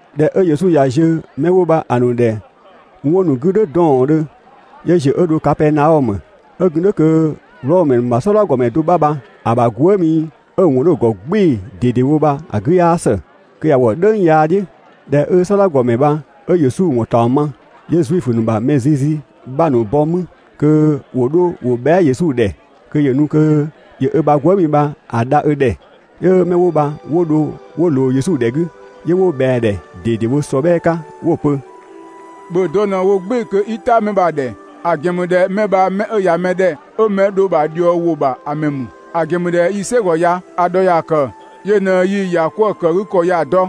꞊Dhɛ 'ö Yesu ꞊ya ziö 'mɛ 'wo bha‑ ‑nu ‑dhɛ 'wɔn ‑nu 'gü "dhʋ̈ 'dɔɔndhö, 'yö ‑ziö 'ö dho Kapɛɛnaɔmö. 'Ö gun "dhʋ̈ kö Wlɔmö ‑mɛ ‑nu ‑bha "sɔdha ‑gɔmɛ do 'bha bha‑ ‑bha gwëëmi 'ö‑ ‑wɔn 'dhö‑ ‑gɔ "gbɩɩ‑ ꞊dedewo bha‑ 'gü 'yaa ‑së, kö ꞊ya wɔ "dhëng yaa "dhiʋ̈. ꞊Dhɛ 'ö "sɔdha ‑gɔmɛ bha 'ö Yesu ‑wɔn ‑taɔng ma, 'yö Zuifö ‑nu ‑bha mɛ zizi 'bha ‑nu bɔ 'mü kö ‑wo 'dho ‑wo bhɛa" Yesu ‑dhɛ kö ‑yö nu kö ‑yö ö ‑bha gwëëmi bha‑ dha ö ‑dhɛ. 'Yö 'mɛ 'wo bha 'wo dho 'wo ꞊loo Yesu ‑dhɛ 'gü, 'yö 'wo ꞊bhɛa‑ ‑dhɛ ꞊dedewo ‑sɔbhɛɛ 'ka 'wo‑ pö: «‑Bhö dɔ ꞊në‑ wo "gbɩɩ‑ kö 'i "ta 'mɛ bha‑ ‑dhɛ, ‑a ‑gɛn ‑mü ꞊dhɛ 'mɛ bha 'mɛ 'ö ꞊ya mɛ ‑dhɛ 'ö mɛ‑ dho‑ ‑bha ꞊dhiɔwʋ ‑bha ‑a ‑mɛ ‑mü; ‑a ‑gɛn ‑mü ꞊dhɛ yii‑ "sɛgɔ ya‑ ‑dhɔ ‑ya ‑kë, yö ꞊në yii‑ ‑yakwëëkëgükɔ ya‑ dɔ.»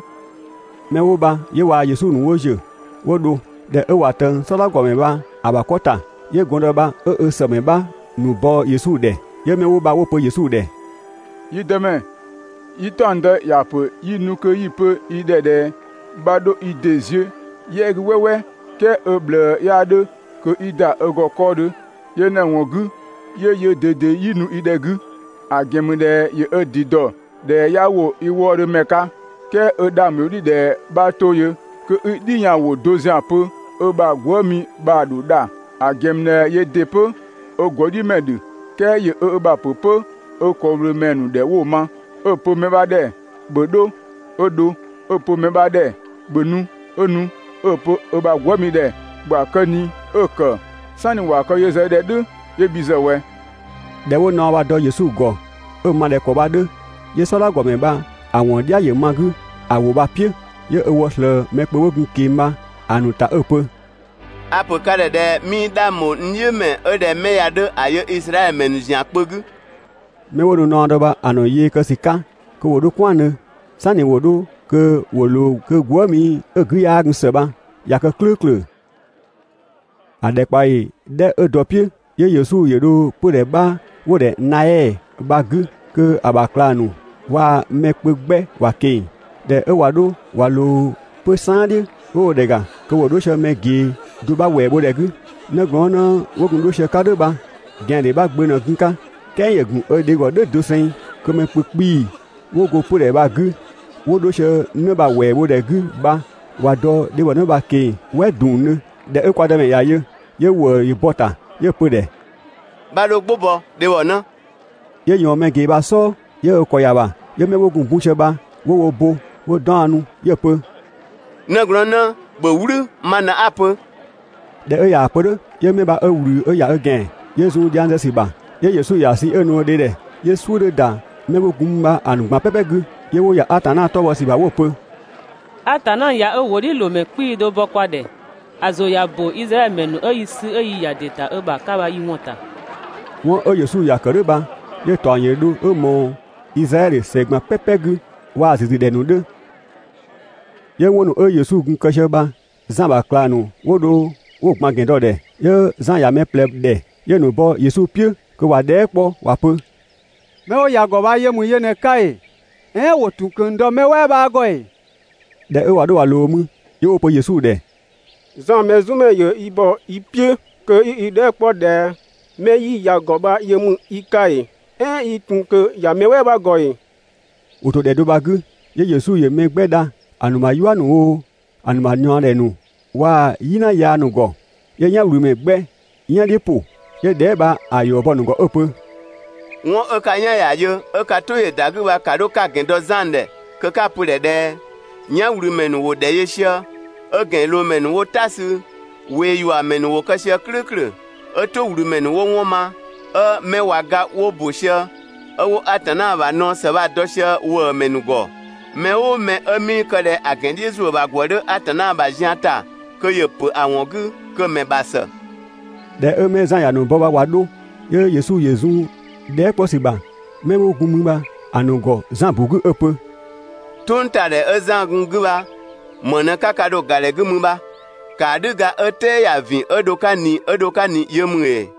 'Mɛ 'wo bha 'yö waa‑ Yesu ‑nu 'wo ‑ziö 'wo dho. ꞊Dhɛ 'ö ꞊wa ꞊tëng "sɔdha ‑gɔmɛ bha‑ ‑bha 'kɔ ‑ta, 'yö gɔndë bha 'ö ö ‑sëmɛ 'bha ‑nu bɔ Yesu ‑dhɛ. 'Yö 'mɛ bha 'wo‑ pö Yesu ‑dhɛ: «Yi Dëmɛ, yi "taɔngdë ‑ya pö 'yi nu kö 'yi‑ pö i ‑dhɛ ꞊dhɛ 'bha 'dho i ‑dɩ ziö "yɛ 'gü "wɛɛwɛɛ, "kɛɛ ö ꞊bhlëë 'yaa 'dhö kö 'i ‑da ö ‑gɔ 'kɔɔdhö. Yö ꞊në‑ ‑wɔn 'gü 'yö yöö ꞊dede 'yii nu i ‑dhɛ 'gü, ‑a ‑gɛn ‑mü ꞊dhɛ ‑yö ö ‑dɩ ‑dɔ ꞊dhɛ 'yaa ‑wo i wëëdhö ‑mɛ 'ka. "Kɛɛ 'ö 'dhang ‑bho "dhiʋ̈ ꞊dhɛ 'bha 'to yö kö 'i "dhiyanwʋ do ‑zian pö, ö ‑bha gwëëmi bha‑ ‑dho dha. ‑A ‑gɛn ‑mü ꞊dhɛ yöö ‑dɩ 'pö ö ‑gɔdhiʋ̈mɛ ‑dhö, "kɛɛ ‑yö ö ‑bha ‑pö 'pö ö ‑kɔwlöömɛ ‑nu ‑dhɛ 'wo‑ ma, 'ö‑ pö mɛ 'bha ‑dhɛ: «‑Bhö 'dho!» 'ö dho, 'ö‑ pö mɛ 'bha ‑dhɛ: «‑Bhö nu!» 'ö nu, 'ö‑ pö ö ‑bha gwëëmi ‑dhɛ: «‑Bhö ‑a kë ꞊ni!» 'ö‑ ‑kë. ("Sanni ‑wa kë yö ‑zë ö ‑dhɛ "dhʋ̈ 'yö bhi ‑zë ꞊wɛ?») ꞊Dhɛ 'wo naɔ bha‑ dɔ Yesu ‑gɔ 'ö‑ ma ꞊dhɛ ‑kɔ bha‑ 'dhö, 'yö "sɔdha ‑gɔmɛ bha‑ ‑wɔn "dhia ‑yö ma‑ 'gü ‑a ‑wʋ bha‑ "piʋ̈. 'Yö ö wɔ ꞊slëë mɛ kpö 'wo gun‑ ꞊keng‑ bha‑ ‑nu ‑ta 'ö‑ pö: «A‑ ‑pö ka ‑dhɛ ꞊dhɛ 'mii 'dhang bho n "dhiʋ̈ ‑mɛ 'ö ꞊dhɛ 'mɛ ya‑ 'dhö ‑a yö Izraɛdhö ‑mɛ ‑nu ‑zian kpö 'gü. 'Mɛ 'wo nu naɔ dɔ bha‑ ‑nu yee kë ‑sü 'ka kö ‑wo 'dho "kwɛandhö, "sanni ‑wo 'dho kö ‑wo ꞊loo kö gwëëmi 'ö‑ 'gü 'yaa gun ‑së bha ꞊ya kë "klʋ̈ʋ̈klʋ̈. ‑A ‑dhɛkpaɔyi 'dhɛ 'ö dɔ‑ "piʋ̈, 'yö Yesu ‑yö dho 'pödhɛ do 'bha 'wo‑ ‑dhɛ Naɛ bha‑ 'gü kö‑ ‑bha ꞊klang ‑nu waa‑ mɛ kpö 'gbɛ ‑wa ꞊keng‑. ꞊Dhɛ 'ö ꞊wa 'dho ꞊wa ꞊loo 'pö‑ "saan "dhiʋ̈, 'wo dho ‑dhɛ ‑ga kö ‑wo 'dho sië mɛ ꞊gee do 'bha ‑wɛɛ bho ‑dhɛ 'gü, 'nëglɔɔnnë 'wo gun 'dho sië‑ 'ka "dhʋ̈ bha ꞊gɛandhe 'bha gbö ꞊në gun‑ 'ka, "kɛɛ ‑yö ‑gun ö dhe ‑gɔ "dhʋ̈ doseng. Kö mɛ kpö 'kpii‑ 'wo go 'pödhɛ bha‑ 'gü 'wo 'dho sië 'në bha ‑wɛɛ bho ‑dhɛ 'gü bha ꞊wa dɔ dhebhɔ bha‑ ꞊keng‑ "wɛ ‑dungdhö. ꞊Dhɛ 'ö kwa Dëmɛ ‑ya yö, 'yö ‑wëë ‑yö bɔ‑ ‑ta 'yö‑ pö‑ ‑dhɛ: «'Bha 'dho "gbʋ bɔ, dhebhɔnë!» 'Yö ꞊yɔɔn mɛ ꞊gee bha‑ "sɔɔ, 'yö ö ‑kɔ ‑ya ‑bha. 'Yö 'mɛ 'wo gun‑ bun sië bha 'wo wo bo 'wo 'daɔnnu, 'yö‑ pö: «'Nëglɔɔnnë, ‑bhö "wlü, ma ꞊në 'a‑ pö!» ꞊Dhɛ 'ö ꞊yaa‑ pö "dhʋ̈, 'yö mɛ bha 'ö ꞊wlü 'ö ‑ya ö ‑gɛan, 'yö zun dhiang zë ‑sü ‑bha. 'Yö Yesu ‑ya sü 'ö‑ nu‑ dhe ‑dhɛ. 'Yö "suʋ̈ 'dhö ‑da mɛ 'wo gun mü bha‑ ‑nu ꞊gban "pɛpɛ 'gü, 'yö 'wo ‑ya Atanna 'tɔ bhɔ ‑sü ‑bha 'wo‑ pö: «Atanna ꞊ya ö ‑wʋdhiʋ̈loomɛ 'kpii‑ do bɔ kwa ‑dhɛ, ‑a ‑zʋ ꞊ya ‑bö (Izraɛdhö ‑mɛ ‑nu 'ö yi sü 'ö yi ‑ya ‑dɩ ‑ta ö ‑bha 'ka) bha yi ‑wɔn ‑ta. 'Wɔn 'ö Yesu ‑ya ‑kë "dhʋ̈ bha, 'yö‑ ‑taɔng ‑yö dho 'ö ꞊mɔɔ Izraɛdhö ‑sɛ ꞊gban "pɛpɛ 'gü waa‑ ‑züzü ‑dhɛ ‑nu 'dhö. 'Yö 'wɔn ‑nu 'ö Yesu gun‑ kë sië bha Zan ‑bha ꞊klang ‑nu 'wo dho 'wo‑ ꞊gban ‑gɛn dɔ‑ ‑dhɛ. 'Yö Zan ‑ya mɛ ꞊plɛ ‑dhɛ 'yö‑ ‑nu bɔ Yesu "piʋ̈ kö ‑wa dhɛɛ" 'kpɔ ‑wa pö: «'Mɛ 'wo ‑ya ‑gɔ bha yö ‑mü yö ꞊në‑ 'ka ‑ee, "ɛɛn ‑wo ‑tun ꞊kö dɔ mɛ "wɛɛ 'bha ‑gɔ ‑ee?» ꞊Dhɛ 'ö ꞊wa 'dho ꞊wa ꞊loo mü, 'yö 'wo‑ pö Yesu ‑dhɛ: «Zan Mɛzumɛ ‑yö yi ‑bɔ i "piʋ̈ kö 'yi i dhɛɛ" 'kpɔ ꞊dhɛ 'mɛ 'yi ‑ya ‑gɔ bha yö ‑mü i 'ka ‑ee, "ɛɛn yi ‑tun ꞊kö ‑ya mɛ "wɛɛ 'bha ‑gɔ ‑ee?» ‑Wo ‑to ‑dhɛ do bha‑ 'gü, 'yö Yesu ‑yö mɛ 'gbɛ dha ‑a ‑nu ‑bha "yua ‑nu oo, ‑a ‑nu ‑bha ꞊niɔɔdhɛ ‑nu waa "yina yaa ‑nu ‑gɔ, 'yö "yanwlümɛ 'gbɛ "yan "dhiʋ̈ ‑pʋ. 'Yö dhɛɛ" bha‑ ‑yɔ bɔ‑ ‑nu ‑gɔ 'ö‑ pö: «'Wɔn 'ö ka "yan ‑ya yö 'ö ka "tʋ ‑yö ‑da 'gü bha, ‑ka 'dho 'ka‑ ‑gɛn dɔ Zan ‑dhɛ kö 'ka‑ pö‑ ‑dhɛ ꞊dhɛ: «"Yanwlümɛ ‑nu ‑wo ‑dhɛ yö sië, 'ö ‑gɛnloomɛ ‑nu 'wo "ta sü, ꞊weeyuamɛ ‑nu ‑wo kë sië "klʋ̈ʋ̈klʋ̈, 'ö "tʋwlümɛ ‑nu 'wo 'wɔn ma, 'ö 'mɛ ꞊wa ga 'wo ‑bö sië, 'ö 'wo Atanna ‑bha naɔ ‑së bha‑ dɔ sië ‑wëëmɛ ‑nu ‑gɔ. Mɛ "ʋʋ mɛ 'ö 'mii kë ꞊dhɛ ‑a ‑gɛn "dhiʋ̈ ‑zuö ‑bha ‑gwë 'dhö Atanna ‑bha zian ‑ta kö ‑yö ‑pö ‑a ‑wɔn 'gü, kö‑ ‑mɛ ‑bha ‑së.» ꞊Dhɛ 'ö 'mɛ 'ö Zan ‑ya ‑nu bɔ bha ꞊wa 'dho, 'yö Yesu ‑yö zun dhɛɛ" 'kpɔ ‑sü ‑bha 'mɛ 'wo gun mü bha‑ ‑nu ‑gɔ Zan ‑bu 'gü 'ö‑ pö: «"Tʋngtadhɛ 'ö Zan gun‑ 'gü bha, ‑më ꞊në 'ka kë dho‑ ‑ga ‑dhɛ 'gü mü bha? ‑Kaadhüga 'ö "tɛɛ ‑ya ‑vin 'ö dho‑ 'ka ꞊ni 'ö dho‑ 'ka ꞊ni yö ‑mü ‑ee?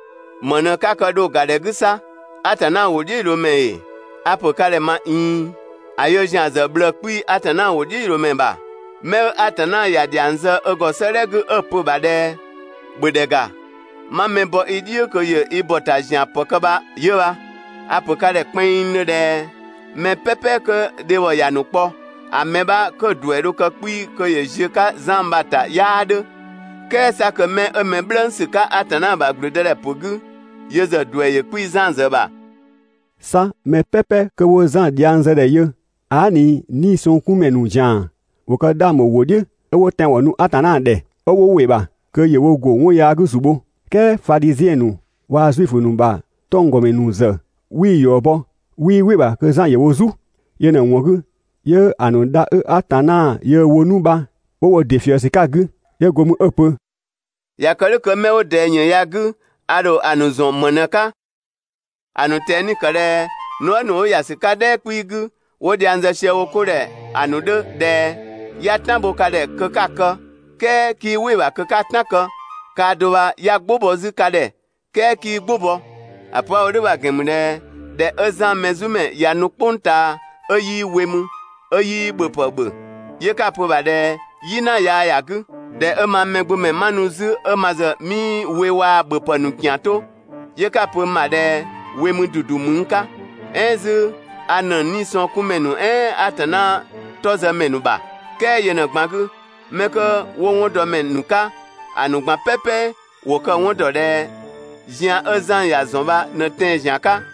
‑Më ꞊në 'ka kë dho ‑ga ‑dhɛ 'gü 'sa? Atanna ‑wʋdhiʋ̈loomɛ ‑ee? A‑ ‑pö ka ‑dhɛ ꞊ma ꞊iin, ‑a yöö ‑zian ‑zë ꞊bhlëë‑ 'kpii‑ Atanna ‑wʋdhiʋ̈loomɛ ‑bha. 'Mɛ 'ö Atanna ‑ya ‑dhiang zë ö ‑gɔ 'sëëdhɛ 'gü 'ö‑ pö‑ ‑bha ꞊dhɛ: ‹‑Bhö ‑dhɛ ‑ga, 'ma mɛ bɔ i "dhiʋ̈ kö ‑yö i ‑bɔ ‑ta ‑zian ‑pë kë bha 'yö bha.› A‑ ‑pö ka ‑dhɛ kpɛnngdhö ꞊dhɛ: Mɛ "pɛpɛ 'kö dhebhɔ ‑ya ‑nu kpɔ, ‑a mɛ 'bha 'kö‑ ‑duɛ dho kë 'kpii‑ kö ‑yö ziö Zan ‑bha ‑ta 'yaa 'dhö, "kɛɛ 'sa kö 'mɛ 'ö mɛ "bhlëngsü 'ka Atanna ‑bha ‑gblüdëdhɛpö 'gü, yö ‑zë ‑duɛ ‑yö 'kpii‑ Zan ‑zë ‑bha.» 'Sa mɛ "pɛpɛ 'kö 'wo Zan dhiang zë ‑dhɛ yö, aa" ꞊ni 'niisɔngkunmɛ ‑nu ‑zian ‑wo kë 'dhang ‑bho ‑wʋ "dhiʋ̈ 'ö 'wo tɛanwɔn nu Atanna ‑dhɛ, 'ö 'wo ‑wɩ ‑bha kö ‑yö wo ‑go 'wɔn yaa 'gü ‑zu bho. "Kɛɛ Fadhiziɛn ‑nu waa‑ Zuifö ‑nu ‑bha 'tɔnggɔmɛ ‑nu ‑zë 'wii‑ ‑yɔ bɔ, 'wii "wɩ‑ ‑bha kö Zan ‑yö wo "zu. Yö ꞊në‑ ‑wɔn 'gü, 'yö ‑a ‑nu dha 'ö Atanna yöö‑ wo 'nu bha 'wo wo ‑dɩ ꞊fië ‑sü 'ka‑ 'gü. 'Yö go mü 'ö‑ pö: «꞊Ya kë "dhʋ̈ kö 'mɛ 'wo ꞊dɛɛ ‑yën ya‑ 'gü, ‑a ‑dho ‑a ‑nu ‑zɔn ‑më ꞊në‑ 'ka? ‑A ‑nu ꞊tɛni‑ ‑kë ꞊dhɛ nuë" ‑nu 'wo ‑ya ‑sü 'ka "dhɛɛ 'kpii‑ 'gü, 'wo dhiang zë sië wo 'ko ‑dhɛ ‑a ‑nu 'dhö ꞊dhɛ: «'Ya "tan bho ka ‑dhɛ kö 'ka‑ kë, "kɛɛ 'kii "wɩ‑ ‑bha kö 'ka "tan kë. Kaa do bha 'ya "gbʋ bɔ 'zü ka ‑dhɛ, "kɛɛ 'kii "gbʋ bɔ! ‑A pö 'a‑ wo "dhʋ̈ bha‑ ‑gɛn ‑mü ꞊dhɛ ꞊dhɛ 'ö Zan Mɛzumɛ ꞊ya nu "kpʋng ꞊taa 'ö 'yii we mü, 'ö 'yii ‑bhöpë ‑bhö, 'yö 'ka‑ pö‑ ‑bha ꞊dhɛ "yina yaa ‑ya 'gü. ꞊Dhɛ 'ö mang Mɛgbömɛ 'ma nu 'zü 'ö ma ‑zë 'mii we waa‑ ‑bhöpë ‑nu ‑kian 'to, 'yö ka‑ pö n ‑bha ꞊dhɛ we mü ‑dudu ‑mü n 'ka. "Ɛɛn 'zü a ‑nëng 'niisɔngkunmɛ ‑nu "ɛɛn Atanna 'tɔ zë ‑mɛ ‑nu ‑bha! "Kɛɛ yö ꞊në‑ ꞊gban 'gü, 'mɛ 'kö 'wo 'wɔndɔmɛ ‑nu 'ka, ‑a ‑nu ꞊gban "pɛpɛ ‑wo kë‑ 'wɔn ‑dɔ ꞊dhɛ zian 'ö Zan ‑ya ‑zɔn bha ꞊në tɛan‑ ‑zian 'ka.»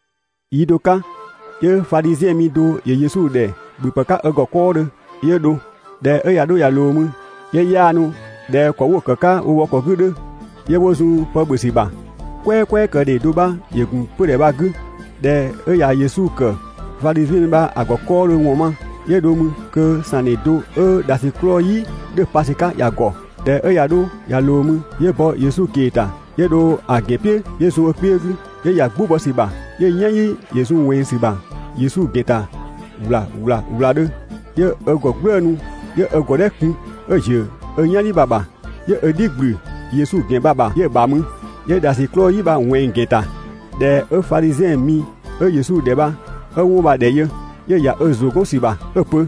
Yi do 'ka 'yö Fadhiziɛn mi do ‑yö Yesu ‑dhɛ ‑bhöpë 'ka ö ‑gɔ 'kɔɔdhö. 'Yö dho. ꞊Dhɛ 'ö ꞊ya 'dho ꞊ya ꞊loo mü, ('yö 'waanu ꞊dhɛ ‑kɔ 'wo‑ ‑kë 'ka wo wɔ ‑kɔ 'gü ‑a 'dhö), 'yö 'wo zun pë ‑bhö ‑sü ‑bha, "kwɛɛkwɛɛkëdhe do 'bha ‑yö ‑gun 'pödhɛ bha‑ 'gü. ꞊Dhɛ 'ö ꞊ya Yesu ‑kë Fadhiziɛn mi bha‑ ‑gɔ 'kɔɔdhö ‑wɔn ma, 'yö dho mü kö ‑sangdhe do 'ö ‑dhasiklɔɔ "yi 'dhö‑ pa ‑sü 'ka ‑ya ‑gɔ. ꞊Dhɛ 'ö ꞊ya 'dho ꞊ya ꞊loo mü, 'yö bɔ Yesu ꞊kee‑ ‑ta, 'yö dho‑ ‑gɛn "piʋ̈ 'yö zun ö kpiö 'gü, 'yö ‑ya "gbʋ bɔ ‑sü ‑bha, 'yö‑ "yanyi ‑yö zun ꞊wɛnng ‑sü ‑bha Yesu ‑gɛn ‑ta ‑wla ‑wla ‑wladhö, 'yö ö ‑gɔ "gblëënu 'yö ö ‑gɔdhɛ kun 'ö‑ ‑ziö ö "yanyi bha‑ ‑bha, 'yö ö "dhi ꞊gblü Yesu ‑gɛn bha‑ ‑bha 'yö‑ ‑bha mü, 'yö ‑dhasiklɔɔ "yi bha‑ ꞊wɛnng‑ ‑gɛn ‑ta. ꞊Dhɛ 'ö Fadhiziɛn mi 'ö Yesu ‑dhɛ bha 'ö 'wɔn bha‑ ‑dhɛ yö, 'yö ‑ya ö ‑zʋ 'gɔn ‑sü ‑bha 'ö‑ pö: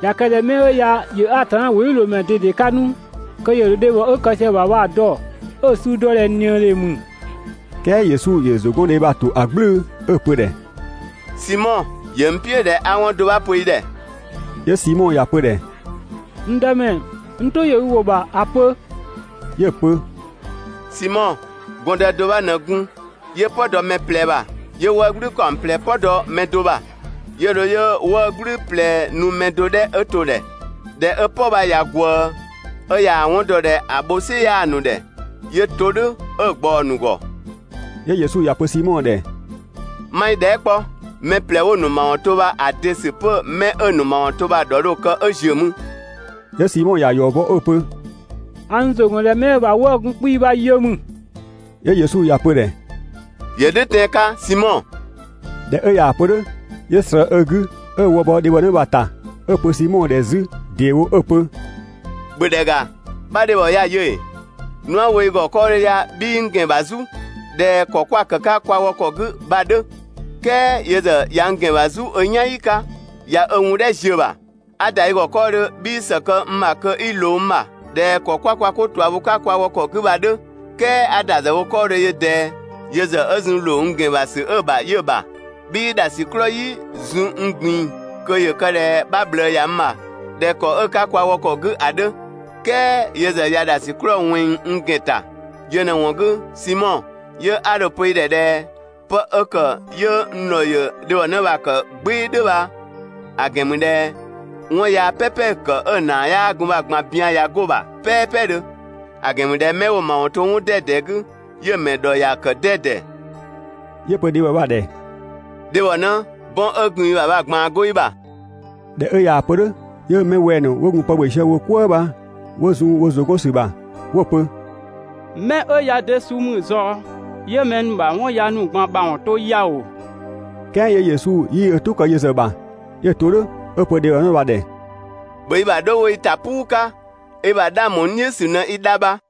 «꞊Ya kë ꞊dhɛ 'mɛ 'ö ya ‑yö Atanna ‑wʋdhiʋ̈loomɛ ꞊dede 'ka 'nu, kö ‑yö ‑dho dhebhɔ 'ö kë sië‑ ‑bha bha‑ dɔ, 'ö‑ suu dɔ ꞊dhɛ ꞊niëdhe ‑mü. "Kɛɛ Yesu ‑yö ‑zʋgɔndhe bha‑ ‑to ‑a "gblʋ̈ʋ̈dhö 'ö‑ pö‑ ‑dhɛ: «Simɔ, ‑yö n "piʋ̈ ꞊dhɛ 'a 'wɔn do 'bha pö i ‑dhɛ.» 'Yö Simɔ ‑ya pö‑ ‑dhɛ: «N Dëmɛ, n "tʋ ‑yö i ‑wʋ ‑bha, ‑a pö!» 'Yö‑ pö: «Simɔ, gɔndë do 'bha ꞊në gun 'yö "pɔ dɔ mɛ ꞊plɛ ‑bha. 'Yö 'wëë‑ "gblü ‑kaɔng ꞊plɛ "pɔ dɔ mɛ do bha, 'yö dho 'yö 'wëë‑ "gblü ꞊plɛ nu mɛ do 'dhɛ to bha‑ ‑dhɛ. ꞊Dhɛ 'ö "pɔ bha ꞊ya ꞊gwëë, 'ö ꞊yaa‑ 'wɔn dɔ ꞊dhɛ ‑a bho "sɩ 'yaa‑ ‑nu ‑dhɛ, 'yö‑ to "dhʋ̈ 'ö‑ ꞊gbaɔ‑ ‑nu ‑gɔ.» 'Yö Yesu ‑ya pö Simɔ ‑dhɛ: «'Ma i dhɛɛ" 'kpɔ: Mɛ ꞊plɛ 'wo‑ ‑nu ‑mawɔn to bha, ‑a de ‑sü 'pö 'mɛ 'ö‑ ‑nu ‑mawɔn to bha‑ ‑dhɔ dho‑ kë 'ö ‑ziö mü?» 'Yö Simɔ ‑ya ‑yɔ bɔ 'ö‑ pö: «A n ‑zʋ ‑gɔn ꞊dhɛ 'mɛ 'ö‑ ‑bha 'wëë‑ gun 'kpii‑ bha yö ‑mü.» 'Yö Yesu ‑ya pö‑ ‑dhɛ: «‑Yö "dhʋ̈ tɛan‑ 'ka, Simɔ!» ꞊Dhɛ 'ö ꞊yaa‑ pö "dhʋ̈, 'yö ꞊slëë ö 'gü 'ö ö wë bɔ dhebhɔnë bha‑ ‑ta 'ö‑ pö Simɔ ‑dhɛ 'zü ‑deewo 'ö‑ pö: «‑Bhö ‑dhɛ ‑ga! 'Bha dhebhɔ ya yö ‑ee?» Nu 'a‑ wo i ‑gɔ 'kɔɔdhö ya 'bhii n ‑gɛn ‑bha "zu (꞊dhɛ ‑kɔ 'kwa‑ ‑kë 'ka kwa wɔ ‑kɔ 'gü bha‑ 'dhö), "kɛɛ yö ‑zë ꞊ya n ‑gɛn ‑bha "zu ö "yanyi 'ka ꞊ya ö wundhɛ ziö‑ ‑bha. 'A ‑da i ‑gɔ 'kɔɔdhö 'bhii ‑së kë n ‑bha kö 'i ꞊loo n ‑bha (꞊dhɛ ‑kɔ 'kwa kwa 'ko ꞊tua bho‑ 'ka kwa wɔ ‑kɔ 'gü bha‑ 'dhö), "kɛɛ 'a ‑da ‑zë wo 'kɔɔdhö yö ꞊dɛɛ, yö ‑zë 'ö zun ‑loo n n ‑gɛn ‑bha ‑sü 'ö‑ bha 'yö‑ ‑bha. 'Bhii ‑dhasiklɔɔ "yi zun n ꞊gbin‑ kö ‑yö kë ꞊dhɛ 'bha ꞊bhlëë ‑ya n ‑bha (꞊dhɛ ‑kɔ 'ö‑ 'ka kwa wɔ ‑kɔ 'gü ‑a 'dhö), "kɛɛ yö ‑zë ꞊ya ‑dhasiklɔɔ ꞊wɛnng n ‑gɛn ‑ta. Yö ꞊në‑ ‑wɔn 'gü, Simɔ, 'yö 'a dho‑ pö i ‑dhɛ ꞊dhɛ 'pë 'ö ‑kë 'yö n ‑dhɔ ‑yö dhebhɔnë bha‑ ‑kë "gbɩɩ‑ "dhʋ̈ bha‑ ‑gɛn ‑mü ꞊dhɛ 'wɔn yaa "pɛpɛ 'ö‑ ‑kë 'ö‑ ‑naa 'yaa gun bha‑ ꞊gban bian ꞊ya 'go‑ ‑bha "pɛɛpɛdhö; ‑a ‑gɛn ‑mü ꞊dhɛ 'mɛ 'wo‑ ‑mawɔn to 'wɔn 'dɛdɛ 'gü, 'yö‑ mɛ ‑dhɔ ‑ya ‑kë 'dɛdɛ.» 'Yö‑ pö dhebhɔ bha‑ ‑dhɛ: «Dhebhɔnë, 'bɔn 'ö gun i ‑bha bha‑ ꞊gbaan 'go i ‑bha!» ꞊Dhɛ 'ö ꞊yaa‑ pö "dhʋ̈, 'yö 'mɛ wɛng‑ ‑nu 'wo gun pë ‑bhö sië wo "kwëë bha 'wo zun wo ‑zʋ 'gɔn ‑sü ‑bha 'wo‑ pö: «'Mɛ 'ö ya de suu ‑mü ꞊zɔɔ 'yö mɛ ‑nu ‑bha 'wɔn yaa ‑nu ꞊gban ‑mawɔn to ya ‑oo?» "Kɛɛ 'yö Yesu 'yii ö "tʋ kë yö ‑zë ‑bha, 'yö‑ to "dhʋ̈ 'ö‑ pö dhebhɔnë bha‑ ‑dhɛ: «‑Bhö i ‑bha dho wo i ‑ta "puu 'ka, i ‑bha 'dhang ‑bho n "dhiʋ̈ ‑sü ꞊në i dha bha.»